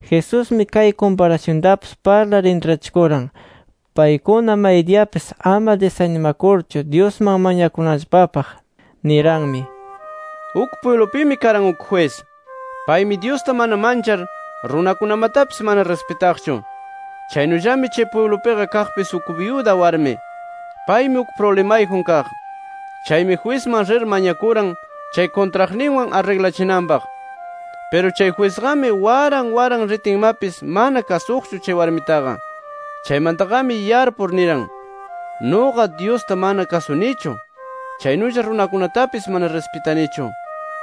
Jesusmi kay kumparasyuntapis parlar intrachikuran, paykuna maydiyapis ama disanimakurchu Dyusman mañakunanllapapaq. Niranmi: “Uk pwiblupimi karan uk jwis. Paymi Dyusta mana manchar, runakunamatapis mana rispitaqchu. Chaynullami chay pwiblupiqa kaqpis uk byuda warmi. Paymi uk prublimayjun kaq. Chaymi jwisman rir mañakuran, chay kuntraqninwan arriglachinanpaq. Piru chay jwisqami waran waran ritinmapis mana kasuqchu chay warmitaqa. Chaymantaqami yarpur niran: Nuqa, Dyusta mana kasunichu. Chaynulla runakunatapis mana rispitanichu.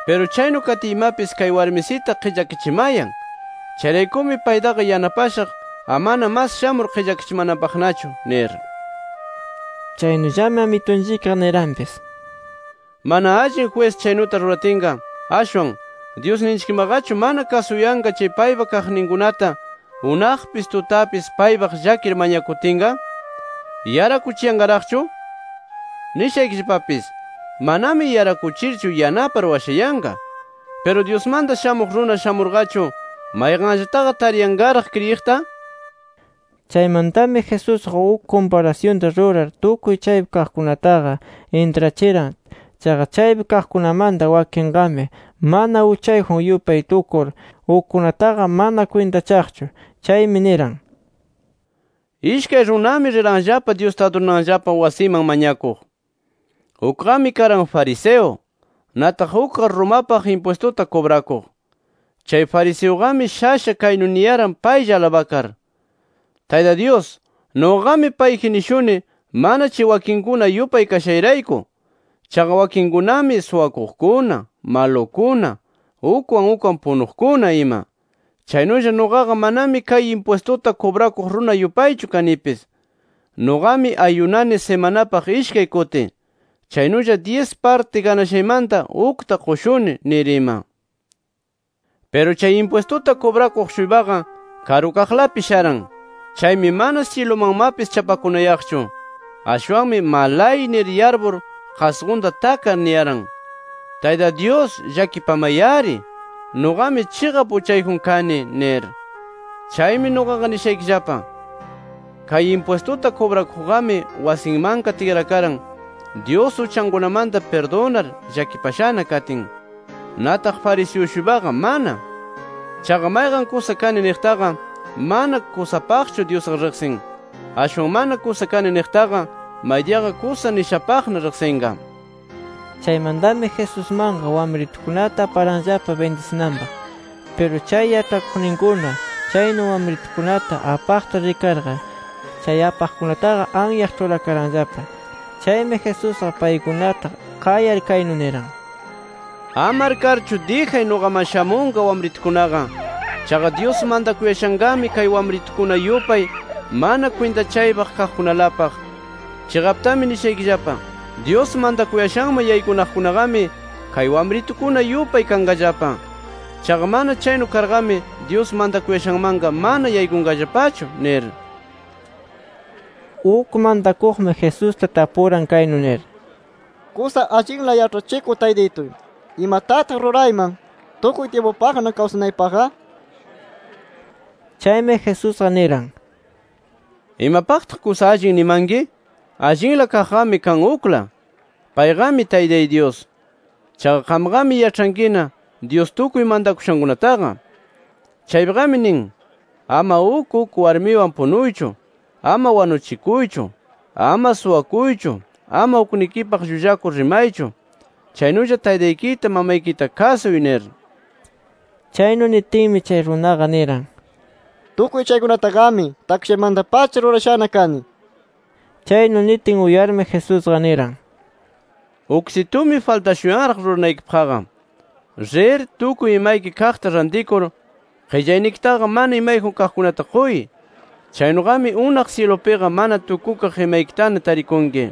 Piru chaynu katiymapis kay warmisita qillakachimayan. Chayraykumi paytaqa yanapashaq amana mas shamur qillakachimananpaqnachu nir”. Chaynullami Amitunchikqa niranpis: “Mana allin jwis chaynuta ruratinqa, ashwan ¿Dyusninchikmaqachu mana kasuyanqa chay paypa kaqninkunata unaqpis, tutapis paypaq llakir mañakutinqa? ¿Yarakuchiyanqaraqchu? Nishaykillapapis: Manami yarakuchirchu yanapar washayanqa. ¿Piru Dyusmanta Shamuq Runa shamurqachu, mayqanllataqa tariyanqaraq kriyiqta? nir”. Chaymantami Jesusqa uk kumparasyunta rurar tukuy chaypi kaqkunataqa intrachiran. Chaqa chaypi kaqkunamanta wakinqami, mana uchayjun yupay tukur ukkunataqa mana kwintachaqchu. Chaymi niran: “Ishkay runami riranllapa Dyusta adurananllapa wasiman mañakuq. Ukqami karan fariseo; nataq ukqa Romapaq impwistuta kubrakuq. Chay fariseuqami shasha kaynu niyaran paylla alabakar: ‘Tayta Dyus, nuqaqami payji nishuni mana chay wakinkuna yupay kashayrayku. Chaqa wakinkunami suwakuqkuna, malukuna, ukwan ukwan punuqkuna ima. Chaynulla nuqaqa manami kay impwistuta kubrakuq runa yupaychu kanipis. Nuqami ayunani simanapaq ishkay kuti. Chaynulla dyis parti ganashaymanta ukta qushuni’ nir ima. “Piru chay impwistuta kubrakuq-shuypaqa karukaqlapi sharan. Chaymi mana syilumanmapis chapakunayaqchu. Ashwanmi malay nir yarpur qasqunta takar niyaran: ‘¡Tayta Dyus llakipamay-ari! ¡Nuqami chiqap uchayjun kani!’ nir. “Chaymi nuqaqa nishaykillapa: Kay impwistuta kubrakuqqami, wasinmanqa tikrakaran, Dyus uchankunamanta pirdunar llakipashana katin. Nataq fariseo-shuypaqa mana. Chaqa mayqan kusa kani niqtaqa, mana kusapaqchu Dyusqa riqsin. Ashwan mana kusa kani niqtaqa, maydiyaqa kusa nishapaqna riqsinqa”. Chaymantami Jesusmanqa wamritukunata aparanllapa bindisinanpaq. Piru chay yaĉhakuqninkuna chaynu wamritukunata apaqta rikarqa, chay apaqkunataqa anyaq ĉhurakaranllapa. Chaymi Jesusqa paykunata qayar, kaynu niran: —¡Ama arkarchu, dijay nuqaman shamunqa wamritukunaqa! Chaqa Dyus mantakuyashanqami kay wamritukuna yupay mana kwintachaypaq kaqkunalapaq. Chiqaptami nishaykillapa: Dyus mantakuyashanman yaykunaqkunaqami kay wamritukuna yupay kanqallapa. Chaqa mana chaynu karqami Dyus mantakuyashanmanqa mana yaykunqallapachu nir. Uk mantakuqmi Jesusta tapuran kaynu nir: —Kusa allinla Yaĉhachikuq Taytituy, ¿imatataq rurayman, tukuy tyimpupaqna kawsanaypaqqa? nir. Chaymi Jesusqa niran: —¿Imapaqtaq kusa allin nimanki? Allinla kaqqami kan ukla. Payqami Taytay Dyus. Chaqa qamqami yaĉhankina, Dyus tukuy mantakushankunataqa. Chaypiqami nin: ‘Ama uk uk warmiwan punuychu; ama wanuchikuychu; ama suwakuychu; ama uknikipaq llullakur rimaychu chaynulla taytaykita, mamaykita kasuy’ nir. Chaynu nitinmi, chay runaqa niran: —Tukuy chaykunataqami takshaymanta-pacha rurashana kani nir. Chaynu nitin uyarmi, Jesusqa niran: —Uksitumi faltashuyanraq ruranaykipaqqa: Rir, tukuy imayki kaqta rantikur qillaynikitaqa mana imayjun kaqkunata quy. Chaynuqami unaq syilupiqa mana tukukaq imaykitana tarikunki.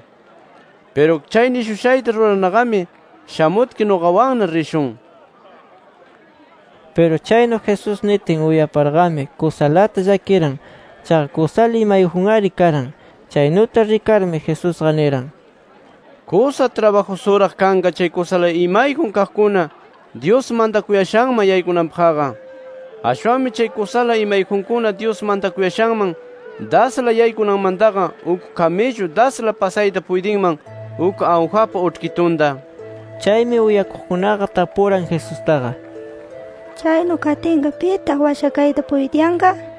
Piru chay nishushayta rurarnaqami, shamutki nuqawanna rishun nir. Piru chaynu Jesús nitin uyaparqami, kusalata llakiran. Chaqa kusala imayjun-ari karan. Chaynuta rikarmi, Jesusqa niran: —¡Kusa trabajusuraq kanqa chay kusala imayjun kaqkuna, Dyus mantakuyashanman yaykunanpaqqa! Ashwanmi chay kusala imayjunkuna, Dyus mantakuyashanman dasla yaykunanmantaqa, uk kamillu dasla pasayta puytinman uk awjapa uĉhkitunta nir. Chaymi uyakuqkunaqa, tapuran Jesustaqa: —Chaynu katinqa ¿pitaq washakayta puytiyanqa? nir.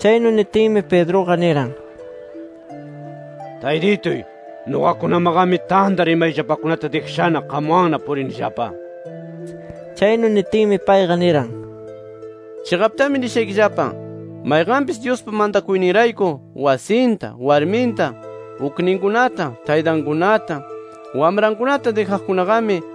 Chaynu nitinmi Pedruqa niran: —Taytituy, nuqakunamaqami tantar imayllapakunata dijashana, qamwanna purinillapa. Chaynu nitinmi, payqa niran: —Chiqaptami nishaykillapa: Mayqanpis Dyuspa mantakuyninrayku, wasinta, warminta, ukninkunata, taytankunata, wamrankunata dijaqkunaqami,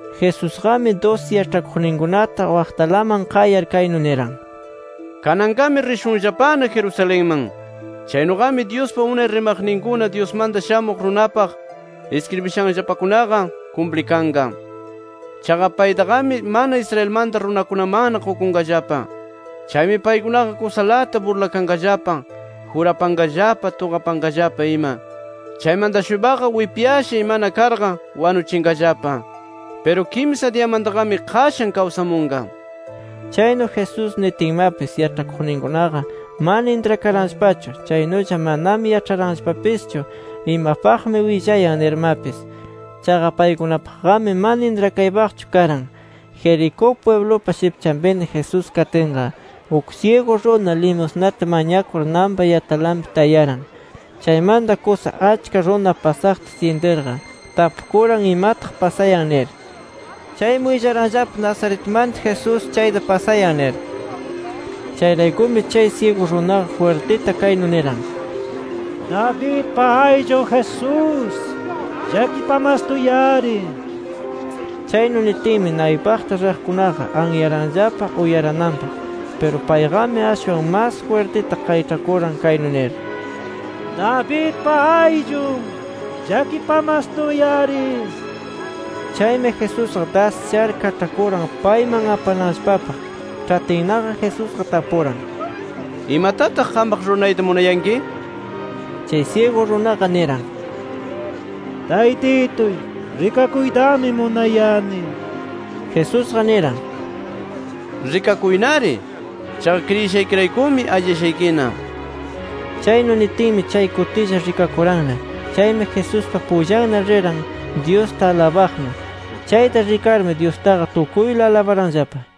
Jesusqami dusi yaĉhakuqninkunata wakaqlaman qayar kaynu niran: “Kananqami rishunllapana Jerusalenman. Chaynuqami Dyuspa unay rimaqninkuna, Dyusmanta Shamuq Runapaq iskribishanllapakunaqa, kumplikanqa. Chaqa paytaqami mana Israelmanta runakunamanna qukunqallapa. Chaymi paykunaqa kusalata burlakanqallapa, jurapanqallapa, tuqapanqallapa ima. Chaymanta-shuypaqa wipyasha imana karqa wanuchinqallapa. Piru kimsa diyamantaqami qashan kawsamunqa”. Chaynu Jesús nitinmapis, yaĉhakuqninkunaqa mana intrakaranllapachu. Chaynulla manami yaĉharanllapapischu imapaqmi willayan nirmapis. Chaqa paykunapaqqami mana intrakaypaqchu karan. Jericó pwiblupa shipchanpina Jesús katinqa, uk syigu runa limusnata mañakur nanpa yatalanpi tayaran. Chaymanta kusa achka runa pasaqta syintirqa, tapukuran imataq pasayan nir. Chaymi willaranllapa Nazaretmanta Jesús chayta pasayan nir. Chayraykumi chay syigu runaqa jwirtita kaynu niran: —¡Davidpa ayllun Jesús, llakipamastuy-ari! nir. Chaynu nitinmi naypaqta riqkunaqa anyaranllapa uyarananpaq. Piru payqami, ashwan mas jwirtita qayĉhakuran kaynu nir: —¡Davidpa ayllun, llakipamastuy-ari! nir. Chaymi Jesusqa, das shar kaĉhakuran payman apananllapapaq. Ĉhatinnaqa, Jesusqa tapuran: —¿Imatataq qampaq ruranayta munayanki? nir. Chay syigu runaqa niran: —Taytituy, rikakuytami munayani nir. Jesusqa niran: —¡Rikakuynari! Chaqa kriyishaykiraykumi alliyashaykina nir. Chaynu nitinmi, chay kutilla rikakuranna. Chaymi Jesuspa pullanna riran Dyusta alabaqnu. Chayta rikarmi Dyustaqa tukuyla alabaranllapa.